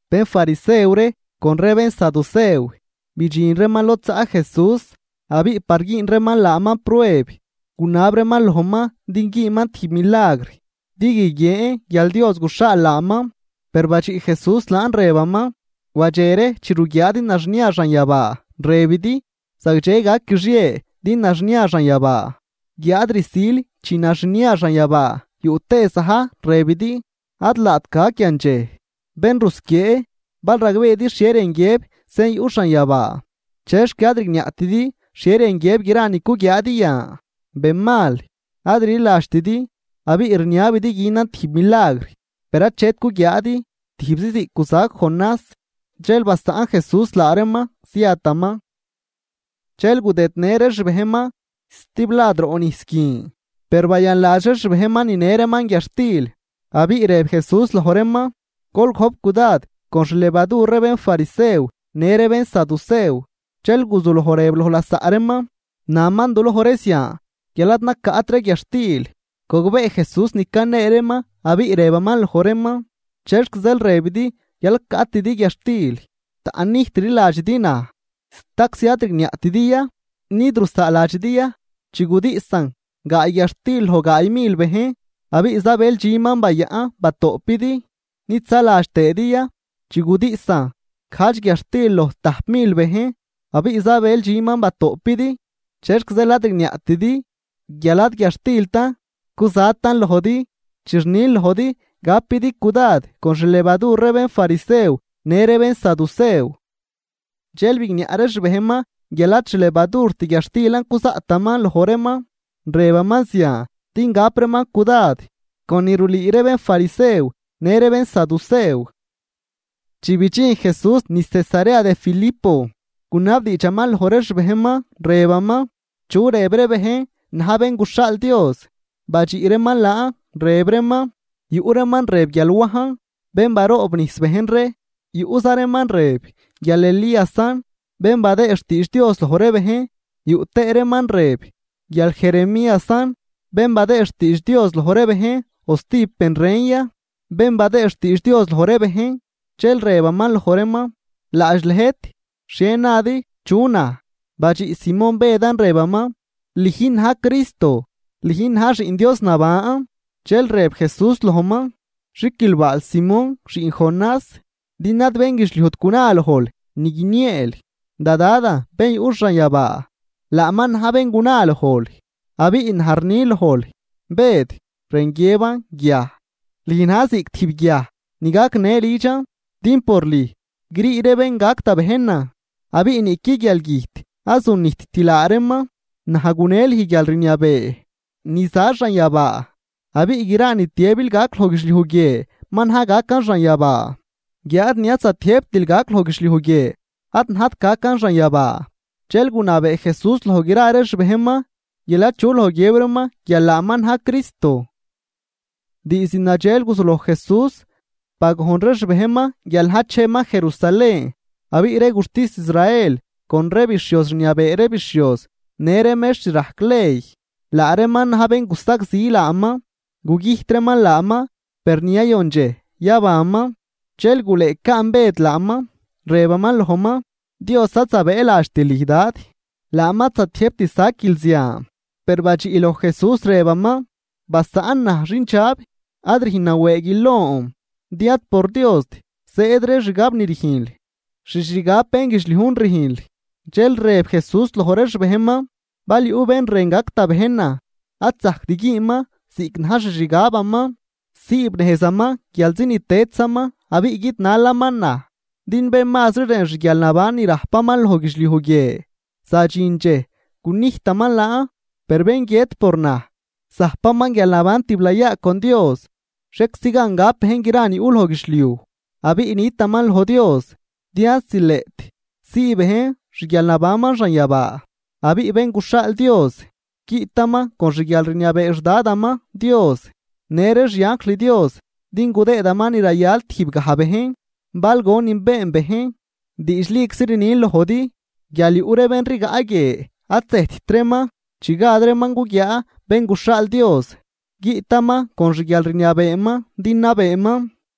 Bénfarisew ree con ree bénsaducew bidxin reeman lod zaꞌ Jesús, abiꞌ par güün reeman laaman prueb gunab reeman lojman din güünman tijb milagr din guiguien guial Dios guxhaal laaman. Per badxiꞌ Jesús laan rëbaman: ―Wadxe ree chi ruguiaadi naxnia xanyabaa, rëbidi: “Zagdxe gac guixie din naxnia xanyabaa.” Guiáad rsil chi naxnia xanyabaa yuꞌ tëë za̱j, rëbidi: “Ad laat gac yandxej.” ¡Bén rusquiee!, bal ragbeedi xhie rën guiëb sen yuꞌ xanyabaa, ¿chexc ad rigniaꞌtidi xhie rën guiëb gra ni cuguiaadi yan? Bén mal, ad rliladxtidi abiꞌ rniabidi günan tijb milagr, per achet guguiaadi, tijbzi ziꞌc guzac Jonás. Dxel basaꞌn Jesús laa reeman, ziataman. Dxel gudëdnë ree xbejnman stiblad roꞌ nijs guin, per bayanladx ree xbejnman ninë reeman guiadxtil. Abiꞌ rëb Jesús loj reeman: ―Gol gojp cudad con xlevadur ree bénfarisew në ree bénsaducew. Dxel guzuloj rëb loj lasaꞌ reeman: ―Naman duloj ree zian guial ad nacaꞌt ree guiadxtil. Gogbee Jesús ni canee reeman abiꞌ rëbaman loj reeman: ―¿Chexc zeel rëbidi guial ad caꞌtidi guiadxtil? Taꞌnnijt rliladxidi naj. ¿Staczi ad rigniaꞌtidi ya? ¿Nid rusaaladxidi ya chi gudiꞌsan gaay guiadxtil loj gaay mil bejn, abiꞌ zabël dxüm ni bayaꞌn batoꞌpidi? ¿Nid zaladx tëëdi ya chi gudiꞌsan gajdx guiadxtil loj tajp mil bejn, abiꞌ zabël dxüman batoꞌpidi? ¿Chexc zeel ad rigniaꞌtidi guial ad guiadxtiltan cuzatan lojdi, chi rnin lojdi gapidi cudad con xlevadur ree bénfarisew në ree bénsadusew? Dxel bigniaꞌ ree xbejnman guial ad xlevadurt guiadxtilan cuzaꞌtaman loj reeman, rëbaman zian din gap reeman cudad con ni rulüü ree bénfarisew në ree bénsaducew. Chi bidxin Jesús niz Cesarea de Filipo, gunabdiidxaman loj ree xbejnman, rëbaman: ―¿Chu rëb ree bejn, na̱j Bén guxhaal Dios? Badxiꞌ reeman laan, rëb reeman: ―Yuꞌ reeman rëb guial Wajn, bén baroobnijs bejn ree. Yuꞌza reeman rëb guial Elíasan, bén badëë xtiidx Dios loj ree bejn, yuꞌ tëë reeman rëb guial Jeremíasan, bén badëëd xtiidx Dios loj ree bejn o stijb ben ren ya, bén badëëd xtiidx Dios loj ree bejn. Dxel rëbaman loj reeman: ―Laadx lëjt, ¿xhie nadi, chu naj? Badxiꞌ Simón Bëdan, rëbaman: ―Lüjn na̱j Cristo. Lüjn na̱j Xiꞌn Dios naban. Dxel rëb Jesús lojman: ―Xiquilbaal, Simón, xiꞌn Jonás, din ad bénguidxliujt guna lojl ni guinieel, da Dadan bén yuꞌ xanyabaa laaman na̱j bén guna lojl. Abiꞌ naj rni lojl, Bëd, (rën guiëban “guiaj”) lüj na̱j ziꞌc tijb guiaj ni gacnë lidxan, din por lüj grii ree bén gac da bejnan abiꞌ niꞌqui guialgüjt ad zunijtt laa reeman. Naj gune lüj guialrniabee ni za xanyabaa, abiꞌ gra ni tiëbil gac loj guidxliuj guie ma na̱j gacan xanyabaa, guiáad ni ad zatiëjbtil gac loj guidxliuj guie ad najt gacan xanyabaa. Dxel gunabee Jesús loj gra ree xbejnman guial achu loj guiëb reeman guial laaman na̱j Cristo. Diizd nadxel guzuloj Jesús bagojn ree xbejnman guial na̱j cheman Jerusalén, abiꞌ ree guxtis Israel con ree bixhioz rniabee ree bixhioz në ree mextr rajc ley, laa reeman na̱j bén gusagzi laaman, gugüjt reeman laaman, per ni yayon dxej yabanman. Dxel gulëëcaan Bëd laaman, rëbaman lojman: ―¡Dios ad zabëëladxt lüj, Dad! ¡Laaman ad zatiëjbt saquil zian! Per badxiꞌ loj Jesús, rëbaman: ―¡Basaꞌn naj, xindxab!, ad rüjn nawëëguil lon. Din ad por Diost zëëd ree xgab ni rüjnl, xixgab bénguidxliujn rüjnl. Dxel rëb Jesús loj ree xbejnman: ―Bal yuꞌ bén rën gac da bejnan ad zajct güünman ziꞌc na̱j xixgabaman, siibnejzaman guialzi ni tëdzaman abiꞌ guidnalaman naj. Din bén mazri rën xguialnaban ni rajpaman loj guidxliuj guie zadxin dxej gunijtaman laan. Per bén guiët por naj, zajpaman guialnaban tiblayaa con Dios. Xhieczi gan gap bejn gra ni yuꞌ loj guidxliuj, abiꞌ nitaman loj Dios. Din ad zileꞌt sii bejn xguialnabanman xanyabaa. Abiꞌ Bén guxhaal Dios, guiꞌtaman con xguialrniabee xDadaman Dios në ree xianjl Dios din gudëëman ni rayal tijbgaj bejn, bal gonin been bejn. Diidxliczi rnin lojdi guial yuꞌ ree bén rigaꞌ guie ad zëjtt reeman chi gad reeman guguiaa Bén guxhaal Dios, guiꞌtaman con xguialrniabeeman din nabeeman.